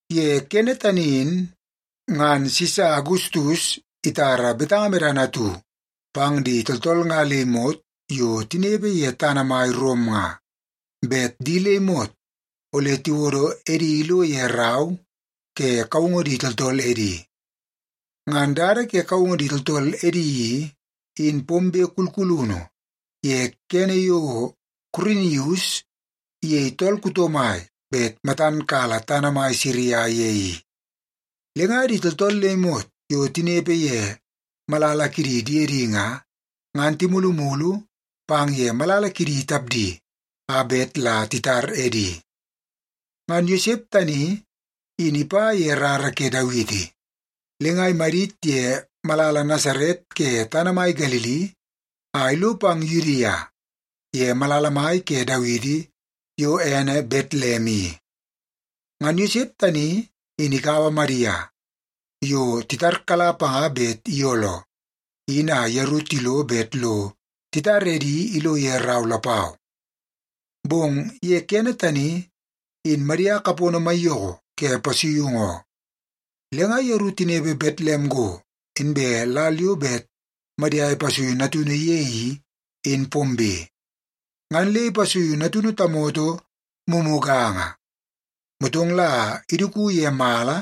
Ye kene tani in, ngan Sisa Agustus itara betanga medana atu pang di tooltool nga le imot yo tinepe ye tana mai Rom nga, bet di le imot ole tiwodo edi ilo ye rau ke kaungu di tooltool edi. Ngan dada ke kaungu di tooltool edi i, in pombe kulkulunu ye kene yo Kurinius iyei tool kuto mai bet matan kala tana mai Siria ye i. Le nga di tooltool le imot yo tinepe ye malala kidi diedi nga, ngan timulumulu pang ye malala kidi tapdi, a bet la titar edi. Ngan Yosep tani in ipa ye rara ke Dawiti. Le nga imadit ye malala Nasaret ke tana mai Galili a ilo pang Yudia ye malala mai ke Dawiti, yo ene Betlem i. Ngan Yosep tani in ikaua Madia, yo titarkala panga bet iyooloo, in a yeru tilo bet lo titar edi ilo ye rau lapau. Bong ye kene tani, in Madia kapono maiyoko ke pasuiungu oo. Le nga yeru tinepe Betlem go, inbe lal yo bet Madia ipasuiu natunu ye i, in pombe, ngan le ipasuiu natunu tamoto mumuganga. Motong la iduku ye mala,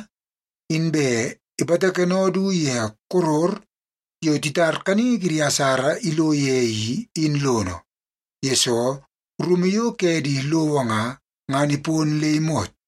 inbe ipatakeno du ye koror yo titar kaningi kidi asara ilo ye i, in lono, yesoo rumu yo ke di lowo nga, ngan ipon le imot.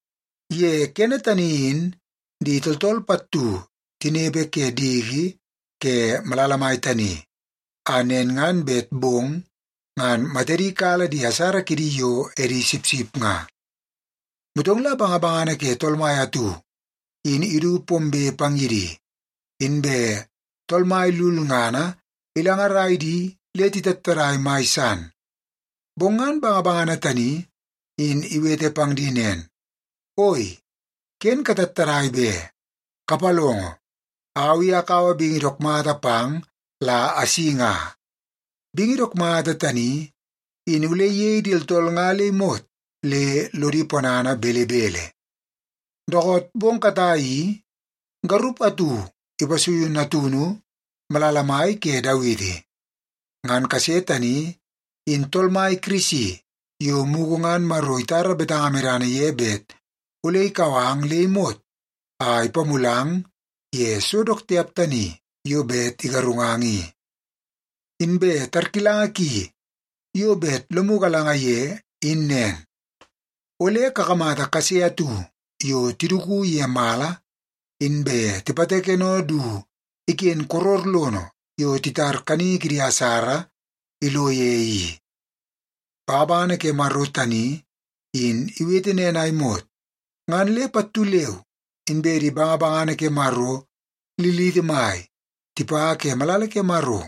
Ye ni tani in di tooltool pattu tinepe ke diki ke malala mai tani, a nen ngan bet bong ngan matadi kala di asara kidi yo edi sipsip nga. Motong la bangabangana ke Tool Mai atu in idu pombe pang ye di, inbe Tool Mai lulngana ilangarai di le titattadai mai san. Bong ngan bangabangana tani in iwete pang di nen, “Oi, ken katattadai be! Kapalongo, au i akaua bingi dook mata pang la asi nga. Bingi dook mata tani in ole iyei di tooltool nga le imot le lodi ponana belebele. Dookoot bong katai i, garup atu ipasuiu natunu malala mai ke Dawiti. Ngan kase tani in Tool Mai Kirisi yo mugu ngan Maro itara betanga medana ye bet ole ikau ang le imot a ipamulang ye so dook tiap tani yo bet igarungang i. Inbe tarkilanga ki yo bet lomu galanga ye, in nen. Ole kakamata kase atu yo tiduku ye mala, inbe tipatakeno du iken koror lono yo titar kaningi kidi asara ilo ye i.” Bangabangana ke Maro tani in iwete nen a imot, ngan le pattu leu inbe di bangabangana ke Maro liliti mai tipa ke malala ke Maro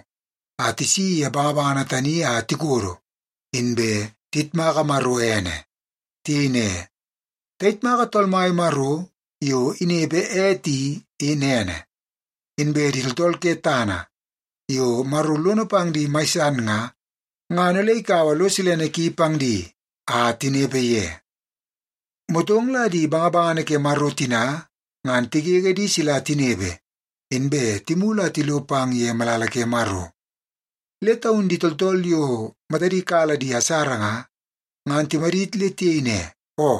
a tisi ye bangabangana tani a tikodo, inbe tiyitmaka Maro ene. Tiyei ne, “Tayitmaka Tool Mai Maro yo inepe ete i, in ene. Inbe di tooltool ke tana yo Maro lono pang di mai san nga, ngan ole ikaua lo silene ki pang di a tinepe ye.” Motong la di bangabangana ke Maro tina ngan tigege di sila tinepe, inbe timulu a tilo pang ye malala ke Maro. Le taun di tooltool yo matadi kala di asara nga, ngan timadit le tiyei ne, “Oo,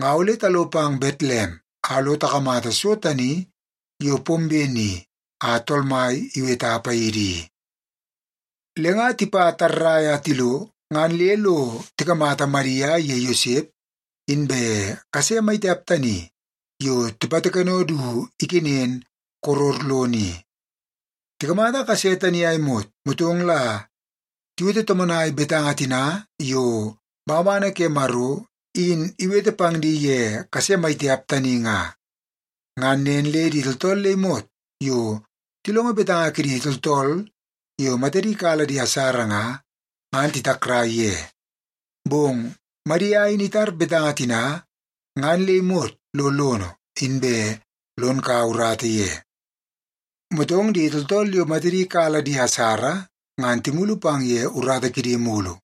nga ole talo pang Betlem a lo takamata so tani yo pombe ni a Tool Mai iweta paidi i.” Le nga tipa tarrai a tilo, ngan le lo tikamata Madia iye Yosep inbe kase maitiap tani yo tipatakeno du ikenen koror lono i. Tikamata kase tani a imot, motong la tiwete tomonai betanga tina yo bangabangana ke Maro in iwete pang di ye kase maitiap tani nga. Ngan nen le di tooltool le imot yo tilongo betanga kidi tooltool yo matadi kala di asara nga, ngan titakrai ye. Bong Madia in itar betanga tina ngan le imot lo lono, inbe lon kaua urata ye. Motong di tooltool yo matadi kala di asara ngan timulu pang ye urata kidi mulu,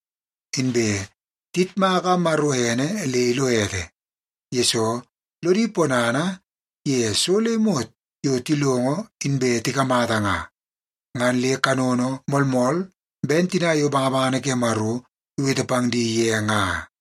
inbe tiyitmaka Maro ene le ilo ete. Yesoo, lodi ponana ye so le imot yo tilongo inbe tikamata nga, ngan le kanono moolmool ben tina yo bangabangana ke Maro iwete pang di ye nga.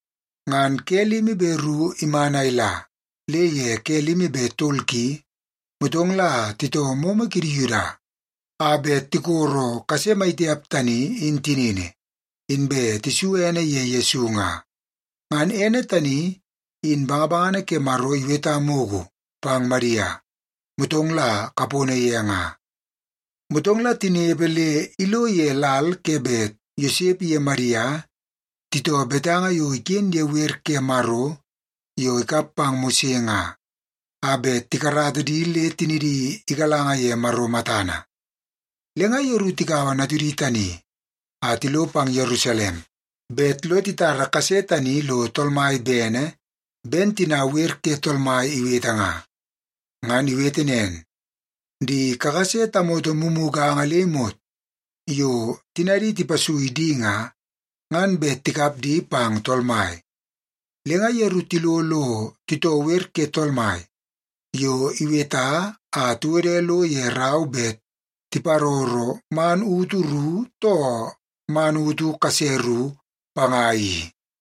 Ngan ke limi be ru iman a ila, le ye ke limi be tol ki, motong la titoo momo kidi Yuda a bet tikoro kase maitiap tani in tinini, inbe tisu ene ye Yesu nga. Ngan ene tani in bangabangana ke Maro iweta mugu pang Madia, motong la kapono ye nga. Motong la tinepe le ilo ye lal ke bet Yosep iye Madia titoo betanga yo iken ye wer ke Maro yo ikap pang Mose nga, a bet tikarata di le tinidi igalanga ye Maro matana. Le nga yeru tikaua natudi tani a tilo pang Yerusalem, bet lo titara kase tani lo Tool Mai bene, ben tina Wer ke Tool Mai iwete nga. Ngan iwete nen, “Di kakase tamoto mumuganga le imot yo tinadi tipasui di nga, ngan bet tikap di pang Tool Mai.” Le nga yeru tilo lo titoo Wer ke Tool Mai yo iweta a tiwode lo ye rau bet tiparoro “man utu ru, too man utu kase ru” panga i.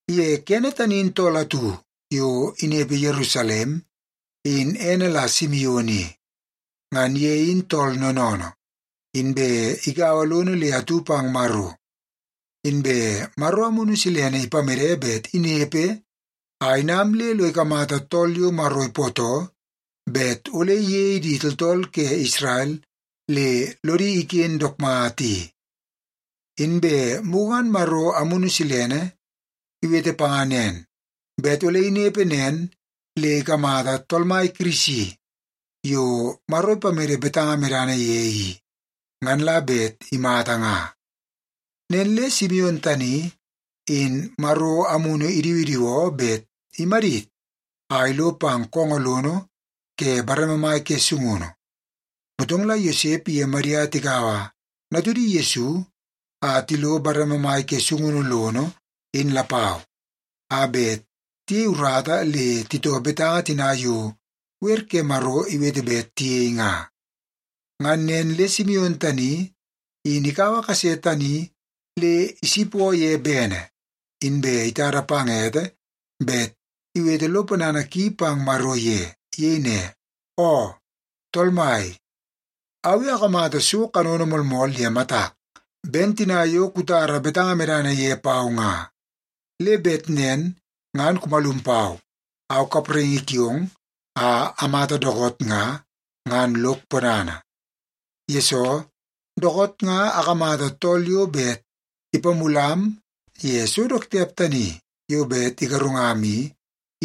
Ye kene tani in tool atu yo inepe Yerusalem, in ene la Simion i. Ngan ye in tool noonoonoo, inbe igaua lono le atu pang Maro. Inbe Maro Amunu Silene ipamede bet inepe a inam le lo ikamata tool yo Maro ipootoo bet ole iyei di tooltool ke Isrel le lodi iken dook mata i. Inbe mugu ngan Maro Amunu Silene iwete panga nen, bet ole inepe nen le ikamata Tool Mai Kirisi yo Maro ipamede betanga medana ye i, ngan la bet imata nga. Nen le Simion tani in Maro Amunu idiwidiwoo bet imadit a ilo pang koongoo lono ke bareme mai ke sungunu. Motong la Yosep iye Madia tikaua natudi Yesu a tilo bareme mai ke sungunu lono, in lapau, a bet tiyei urata le titoo betanga tina yo Wer ke Maro iwete bet tiyei nga. Ngan nen le Simion tani in ikaua kase tani le isipoo ye bene, inbe itada pang ete bet iwete lo ponana ki pang Maro ye. Iyei ne, “Oo Tool Mai, au i akamata so kanono moolmool ye matak, ben tina yo kutara betanga medana ye pau nga, le bet nen ngan kumalum pau, au kapraingi kiong, a amata dookoot nga, ngan lok ponana. Yesoo, dookoot nga akamata tool yo bet ipamulam ye so dook tiap tani yo bet igarungam i,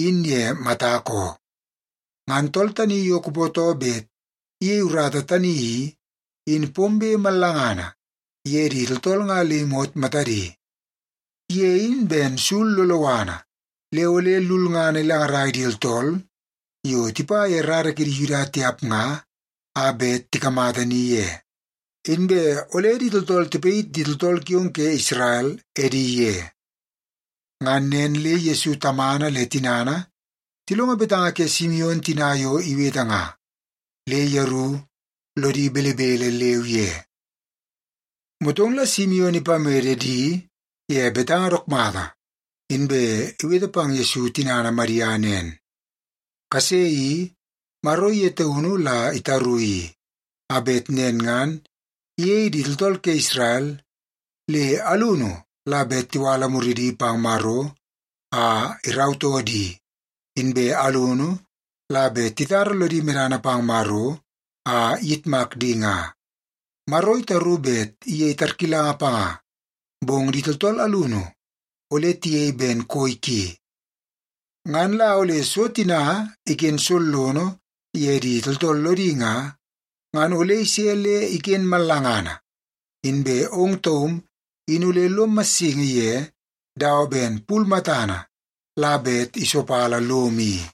in ye matak oo. Ngan tool tani yo kupootoo bet iyei urata tani i, in pombe mallangana ye di tooltool nga le imot matadi. Ye in ben sul loloana, le ole lulngana ilangarai di tooltool yo tipa ye rara kidi Yuda tiap nga a bet tikamata ni ye, inbe ole di tooltool tipayit di tooltool kiong ke Isrel edi ye.” Ngan nen le Yesu tamana le tinana tilongo betanga ke Simion tina yo iwete nga, le yeru lodi belebele leu ye. Motong la Simion ipamede di ye betanga dook mata, inbe iwete pang Yesu tinana Madia nen, “Kase i, Maro ye taunu la itaru i, a bet nen ngan iyei di tooltool ke Isrel, le alunu la bet tiwala muridi pang Maro a irautoo di, inbe alunu la bet titara lodi medana pang Maro a iyitmak di nga. Maro itaru bet iyei tarkilanga panga, bong di tooltool alunu ole tiyei ben koi ki. Ngan la ole so tina iken sollono ye di tooltool lodi nga, ngan ole ise le iken mallangana. Inbe ong taum in ole lom massingi ye dawa ben pul matana la bet isopala lom i.”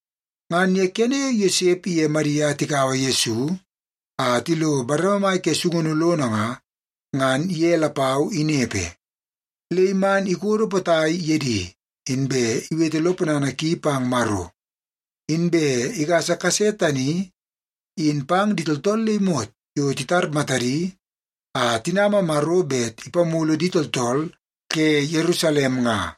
Ngan ye kene yo Yosep iye Madia tikaua Yesu a tilo bareme mai ke sungunu lono nga, ngan ye lapau inepe. Le iman ikodo potai ye di, inbe iwete lo ponana ki pang Maro. Inbe igasa kase tani in pang di tooltool le imot yo titar matadi a tinama Maro bet ipamulu di tooltool ke Yerusalem nga.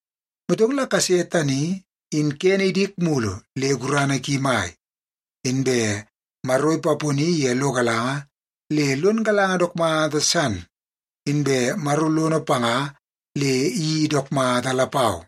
Motong la kase tani in kene idik mulu le gurana ki mai. Inbe Maro ipaponi ye lo galanga le lon galanga dook mata san, inbe Maro lono panga le iyeii dook mata lapau.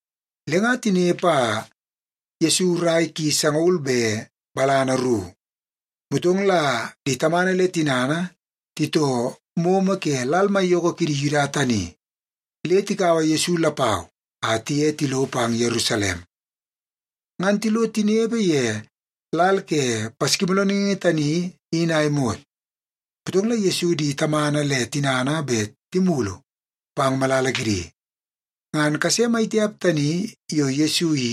Le nga tinepe a Yesu rai ki sangaul be balana ru, motong la di tamana le tinana titoo momo ke lal maiyoko kidi Yuda tani le tikaua Yesu lapau a tiye tilo pang Yerusalem. Ngan tilo tinepe ye lal ke Paskimoolooningi tani in a imot, motong la Yesu di tamana le tinana bet timulu pang malala kidi. Ngan kase mai tiap tani yo Yesu i,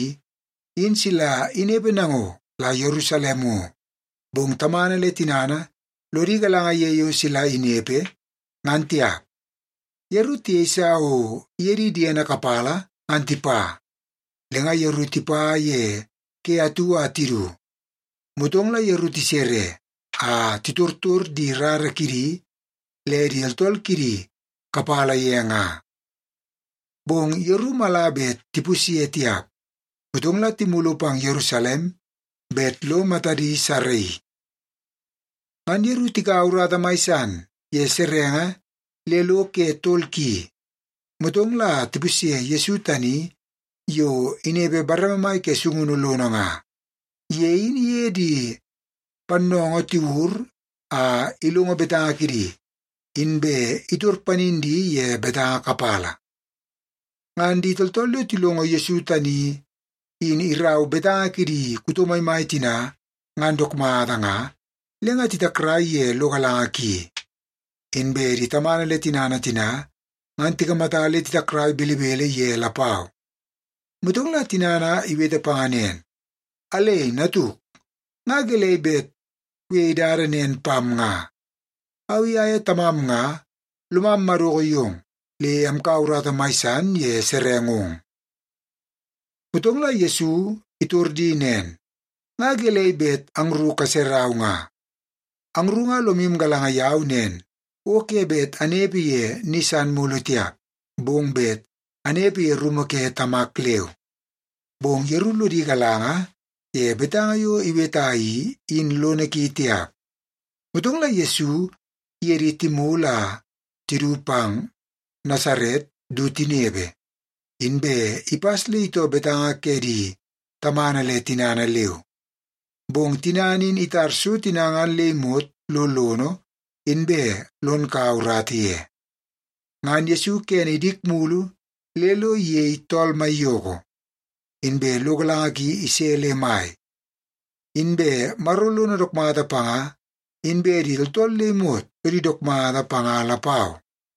in sila inepe nango la Yerusalem ngo, bong tamana le tinana lodi galanga ye yo sila inepe, ngan tiap. Yeru tiyeisa o iye di diedi kapala ngan tipa. Le nga yeru tipa ye ke atu a tidu. Motong la yeru tisere, a titortor di rara kidi le di tooltool kidi kapala ye nga. Bong yeru mala bet tipusye tiap, motong la timulu pang Yerusalem bet lo matadi saraii. Ngan yeru tikaua urata mai san ye serenge le lo ke tol ki, motong la tipusye Yesu tani yo inepe bareme mai ke sungunu lono nga. Ye in iye di pannoongoo tiwur a ilongo betanga kidi, inbe itor panin di ye betanga kapala. Ngan di tooltool yo tilongo Yesu tani in irau betanga kidi kuto maimai tina ngan dook mata nga, le nga titakrai ye lo galanga ki. Inbe di tamana le tinana tina ngan tikamata le titakrai belebele ye lapau. Motong la tinana iwete panga nen, “Alei natuk, nga gelei bet kuyei dada nen pam nga? Au i aye tamam nga lomam madoko yong, le amkaua urata mai san ye serengong.” Motong la Yesu itor di nen, “Nga gelei bet angru kaserau nga? Angru nga lomu galanga yau nen o ke bet anepe ye ni san mulu tiap, bong bet anepe ye rumu ke Tamak leu.” Bong yeru lodi galanga ye betanga yo iweta i, in lono ki tiap. Motong la Yesu iye di timulu a tidu pang Nasaret du tinepe, inbe ipas le itoo betanga ke di tamana le tinana leu. Bong tinana in itar so tina ngan le imot lo lono, inbe lon kaua urata ye. Ngan Yesu kene idik mulu le iyei tool maiyoko, inbe lo galanga ki ise le mai. Inbe Maro lono dook mata panga, inbe di tooltool le imot lodi dook mata panga lapau.